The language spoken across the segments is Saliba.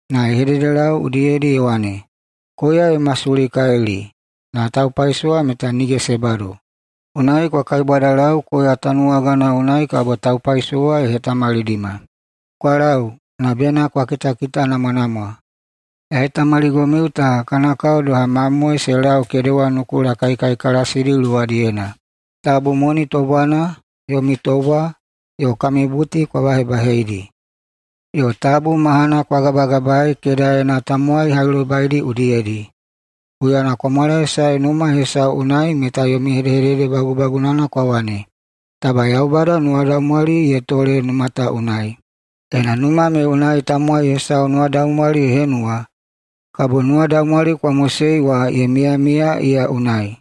Ye hededelau udiyedi ye wane, “Koya ye masulikalili, na taupaisowa meta nige se bado. Unai kwa kaibwadalau koya tanuwagana unai kabo taupaisowa ye hetamalidima. Kwa lau, na bena kwa kitakitanamwanamwa! Ya hetamaligomiu ta kana kao doha mamoe se lau kedewa nukula kaikaikalasidi luwadiyena. Tabu moni tobwana, yomi tobwa, yo kami buti kwa bahebaheidi, yo tabu mahana kwa gabagabai kedaena tamowai hailobaidi udiyedi. Huyana kwa mwalaesae numa hesau unai meta yomi hedehedede bagubagunana kwa wane, ‘Taba Yaubada nuwadaumwali ye tole numa ta unai!’ Ena numa me unai tamowai hesau nuwadaumwali ye henuwa, kabo nuwadaumwali kwa mosei wa ye miyamiya iya unai.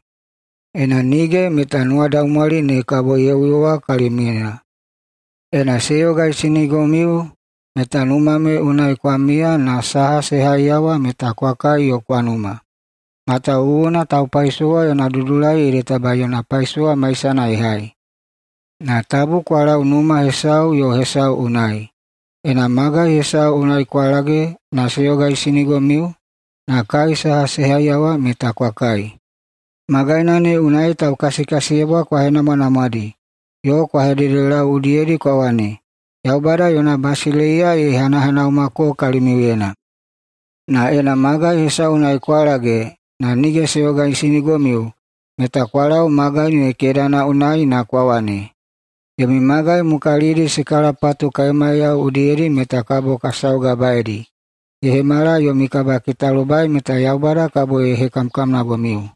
Ena nige, meta nuwadaumwali ne kabo ye uyowa kalimiuyena. Ena se yogaisinigomiu, meta numa ne unai kwa miya na saha se haiyawa meta kwa kai yo kwa numa. Matawuwuna taupaisowa yona dudulai ede taba yona paisowa maisana ye hai. Na tabu kwa lau numa hesau yo hesau unai. Ena magai hesau unai kwa lage na se yogaisinigomiu na kai saha se haiyawa meta kwa kai. Magaina ne unai taukasikasiyebwa kwa henamwanamwadi yo kwa hededelau udiyedi kwa wane, ‘Yaubada yona basileiya ye hanahanaumako kalimiuyena.’ Na ena magai hesau unai kwa lage na nige se yogaisinigomiu meta kwa lau magai ne kedana unai na kwa wane, ‘Yomi magai mukalidi se kalapatu kaemaiyao udiyedi kabo ka saugabaedi, ye hemala yomi kabakitalobai meta Yaubada kabo ye hekamkamnagomiu.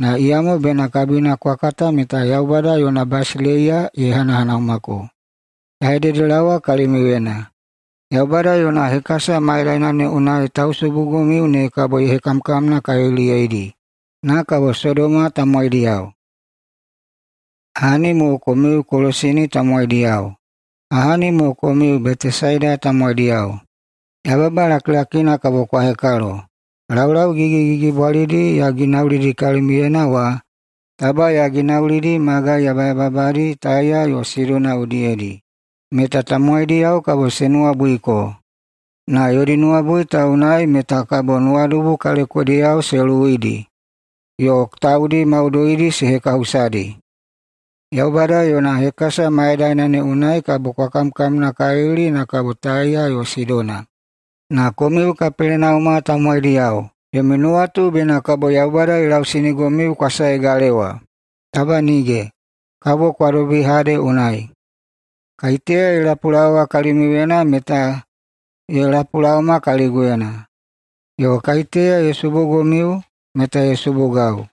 Na iyamo bena kabina kwa kata meta Yaubada yona basileiya ye hanahanaumako.’ Ya hededelaowa kalimiuyena: Yaubada yona hekasa mayadaina ne unai tausubugomiu ne kabo ye hekamkamnakaliliyeidi, na kabo Sodoma tamowaidiyao. Ahani mo komiu Kolasini tamowaidiyao! Ahani mo komiu Betesaida tamowaidiyao! Yababa lakilakina kabo kwa hekalo! Laulau gigigigibwalidi ya ginaulidi kalimiuyena wa, taba ya ginaulidi magai yabayababadi Taiya yo Sidona udiyedi, meta tamowaidiyao kabo se nuwabuiko, na yodi nuwabui ta unai meta kabo nuwadubu kalekodiyao se luwuidi yo taudi maudoidi se hekahusadi. Yaubada yona hekasa mayadaina ne unai kabo kwa kamkamnakalili na kabo Taiya yo Sidona. Na komiu Kapelenauma tamowaidiyao, yomi nuwatu bena kabo Yaubada ye lausinigomiu kwa sae galewa? Taba nige! Kabo kwa dobi Hade unai. Kaiteya ye lapulaowa kalimiuyena meta ye lapulaoma kaliguyena. Yo kaiteya ye subugomiu meta ye subugau.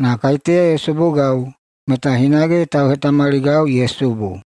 Na kaiteya ye subugau meta hinage tauhetamaligau ye subu.”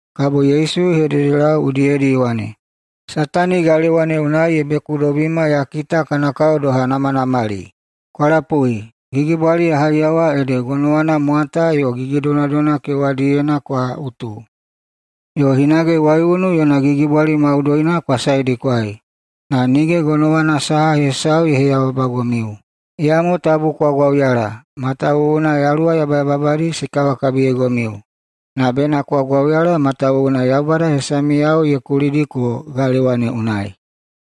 Kabo Yesu ye hededelau udiyedi ye wane, “Satani galewa ne unai ye bekudobima ya kita kana kao doha namanamali. Kwa lapui, gigibwali ya haiyawa ede gonowana mwata yo gigidonadona kewadiyena kwa utu, yo hinage waiunu yona gigibwali maudoina kwa saedikwai. Na nige gonowana saha hesau ye heyababagomiu. Iyamo tabu kwa gwauyala matawuwuna yaluwa yabayababadi se kawakabiyeigomiu. Na bena kwa gwauyala matawuwuna Yaubada hesamiyao ye kulidiko galewa ne unai!”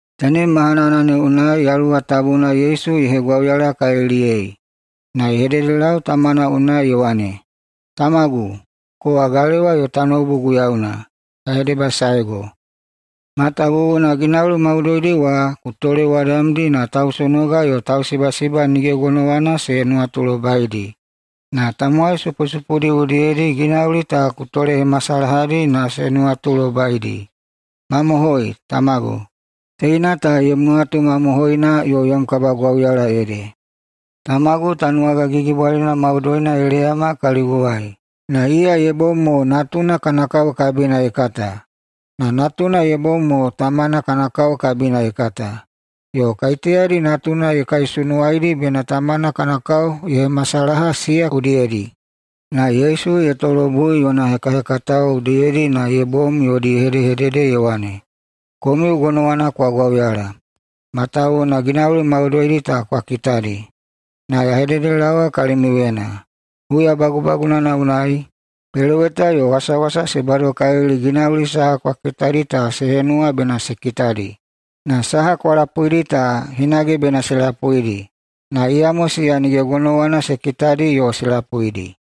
Tenem mahanana ne unai Yaluwa Tabuna Yesu ye hegwauyalakaliliyei na ye hededelau tamana unai ye wane, “Tamagu, kowa galewa yo tanoubu Guiyauna, ya hedebasaego matawuwuna ginauli maudoidi wa ku tolewadamdi na tausonoga yo tausibasiba nige gonowana se nuwatulobaidi. Na tamowai supusupudi udiyedi ginauli ta ku tolehemasalahadi na se nuwatulobaidi. Mamohoi, tamagu, teina ta yom nuwatu mamohoina yo yom kabagwauyala ede. Tamagu tanuwaga gigibwalina maudoina ye leyama kaliguwai, na iya ye bom mo natuna kana kao kabina ye kata, na natuna ye bom mo tamana kana kao kabina ye kata, yo kaiteyadi natuna ye kaisunuwaidi bena tamana kana kao ye hemasalaha siya udiyedi.” Na Yesu ye tolobui yona hekahekatao udiyedi na se bom yodi ye hedehedede ye wane, “Komiu gonowana kwa gwauyala matawuwuna ginauli maudoidi ta kwa kitadi. Na ya hededelaowa kalimiuyena: [Huya bagubagunana unai,] peloweta yo wasawasa se badokalili ginauli saha kwa kitadi ta se henuwa bena se kitadi, yo saha kwa lapuidi ta hinage bena se lapuidi. Na iyamo siya nige gonowana se kitadi yo se lapuidi.”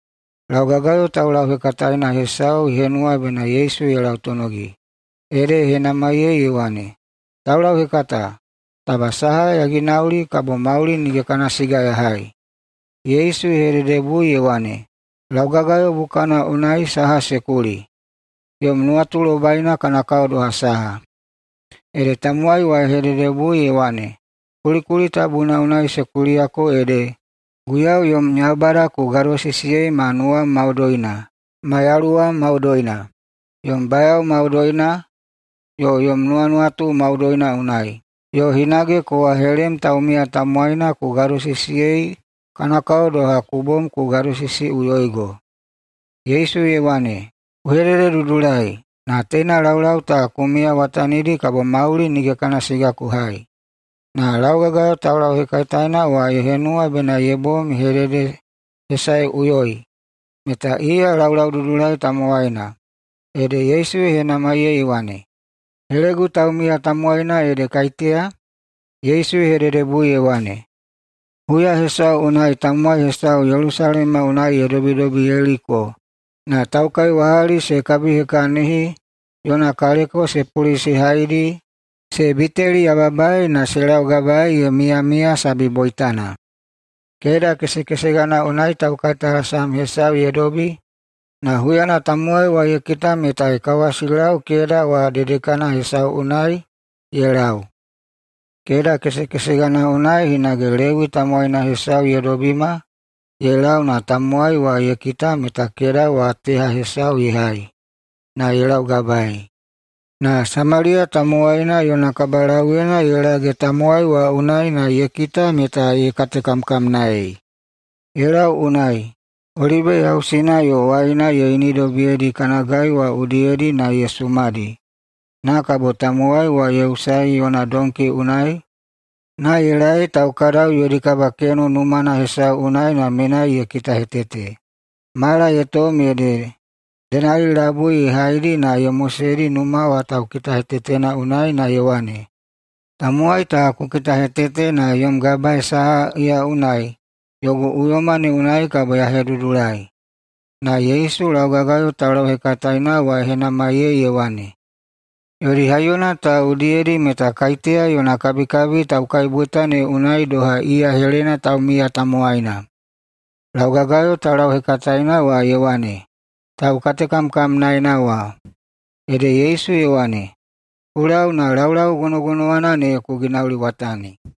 Laugagayo taulauhekataena hesau ye henuwa bena Yesu ye lautonogi, ede ye henamaiyei ye wane, “Taulauhekata, taba saha ya ginauli, kabo mauli nige kana siga ya hai?” Yesu ye hededebui ye wane, “Laugagayo bukana unai saha se kuli? Yom nuwatulobaina kana kao doha saha?” Ede tamowai wa ye hededebui ye wane, “Kulikuli tabuna unai se kuliyako ede, ‘Guiyau yom Yaubada ku gadosisiyei ma nuwam maudoina, ma yaluwam maudoina, yom bayao maudoina yo yom nuwanuwatu maudoina unai’, yo hinage: ‘Kowa helem taumiya tamowaina ku gadosisiyei kana kao doha ku bom ku gadosisiꞌuyoigo.’” Yesu ye wane, “Ku hedededudulai, na teina laulau ta ku miyawatanidi, kabo mauli nige kana siga ku hai.” Na laugagayo taulauhekataena wa ye henuwa bena ye bom ye hededehesaeꞌuyoi meta iya laulaududulai tamowaina, ede Yesu ye henamaiyei ye wane, “Helegu taumiya tamowaina ede kaiteya?” Yesu ye hededebui ye wane, “Huya hesau unai tamowai hesau Yelusalema unai ye dobidobi Yeliko na taukaiwahali se kabihekahini, yona kaleko se pulisihaidi, se biteliyababai na se laugabaei ye miyamiya sabi boitana. Keda kesekesegana unai taukaitalasam hesau ye dobi na huyana tamowai wa ye kita meta ye kawasilau keda wa dedekana hesau unai ye lau. Keda kesekesegana wa unai hinage Lewi tamowaina hesau ye dobima ye lau na tamowai wa ye kita meta keda wa teha hesau ye hai na ye laugabaei. Na Samaliya tamowaina yona kabalauyena ye lage tamowai wa unai na ye kita meta ye katekamkamnaei. Ye lau unai, olibe yausina yo waina ye inidobiyedi kana gai wa udiyedi na ye sumadi. Na kabo tamowai wa ye hetulisaei yona donki unai na ye laei taukadau yodi kabakeno numana hesau na menai ye kitahetete. Mala ye tom ede denali labui ye haidi na ye moseidi numa wa taukitakitahetetena unai na ye wane, ‘Tamowai ta ku kitahetete na yom gabae saha iya unai, yogu uyoma ne unai kabo ya hedudulai.’” [Na Yesu laugagayo taulauhekataena wa ye henamaiyei ye wane,] “Yodi haiyona ta udiyedi meta kaiteya yona kabikabi taukaiboita ne unai doha iya helena taumiya tamowaina?” Laugagayo taulauhekataena wa ye wane, “Taukatekamkamnaena wa.” Ede Yesu ye wane, “Ku lau na laulau gonogonowana ne ku ginauliwatani!”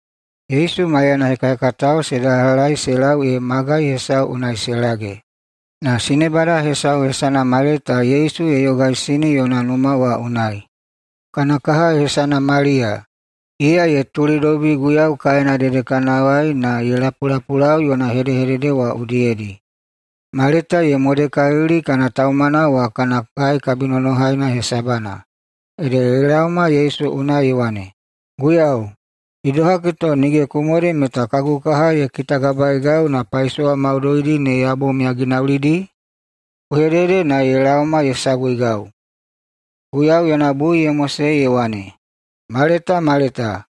Yesu maiyana hekahekatao se dalahai se lau ee magai hesau unai se lage. Na sinebada hesau hesana Maleta Yesu ye yogaisini yona numa wa unai. Kana kaha hesana Maliya, iya ye tulidobi Guiyau kaena dedekanawai na ye lapulapulau yona hedehedede wa udiyedi. Maleta ye modekalili kana taumana wa kana kai kabinonohaina hesabana. Ede ye laoma Yesu unai ye wane, “Guiyau, idohagi to nige ku mode meta kagu kaha ye kitagabaegau na paisowa maudoidi ne ya bom ya ginaulidi? Ku hedede na ye laoma ye saguigau!” Guiyau yona bui ye mosei ye wane, “Maleta, Maleta,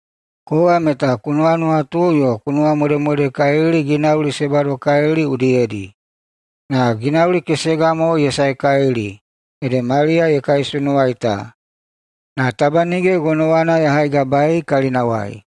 kowa meta ku nuwanuwatu yo ku nuwamodemodekalili ginauli se badokalili udiyedi. Na ginauli kesega mo ye saekalili ede Maliya ye kaisunuwai ta, na taba nige gonowana ya haigabaei kalinawai!”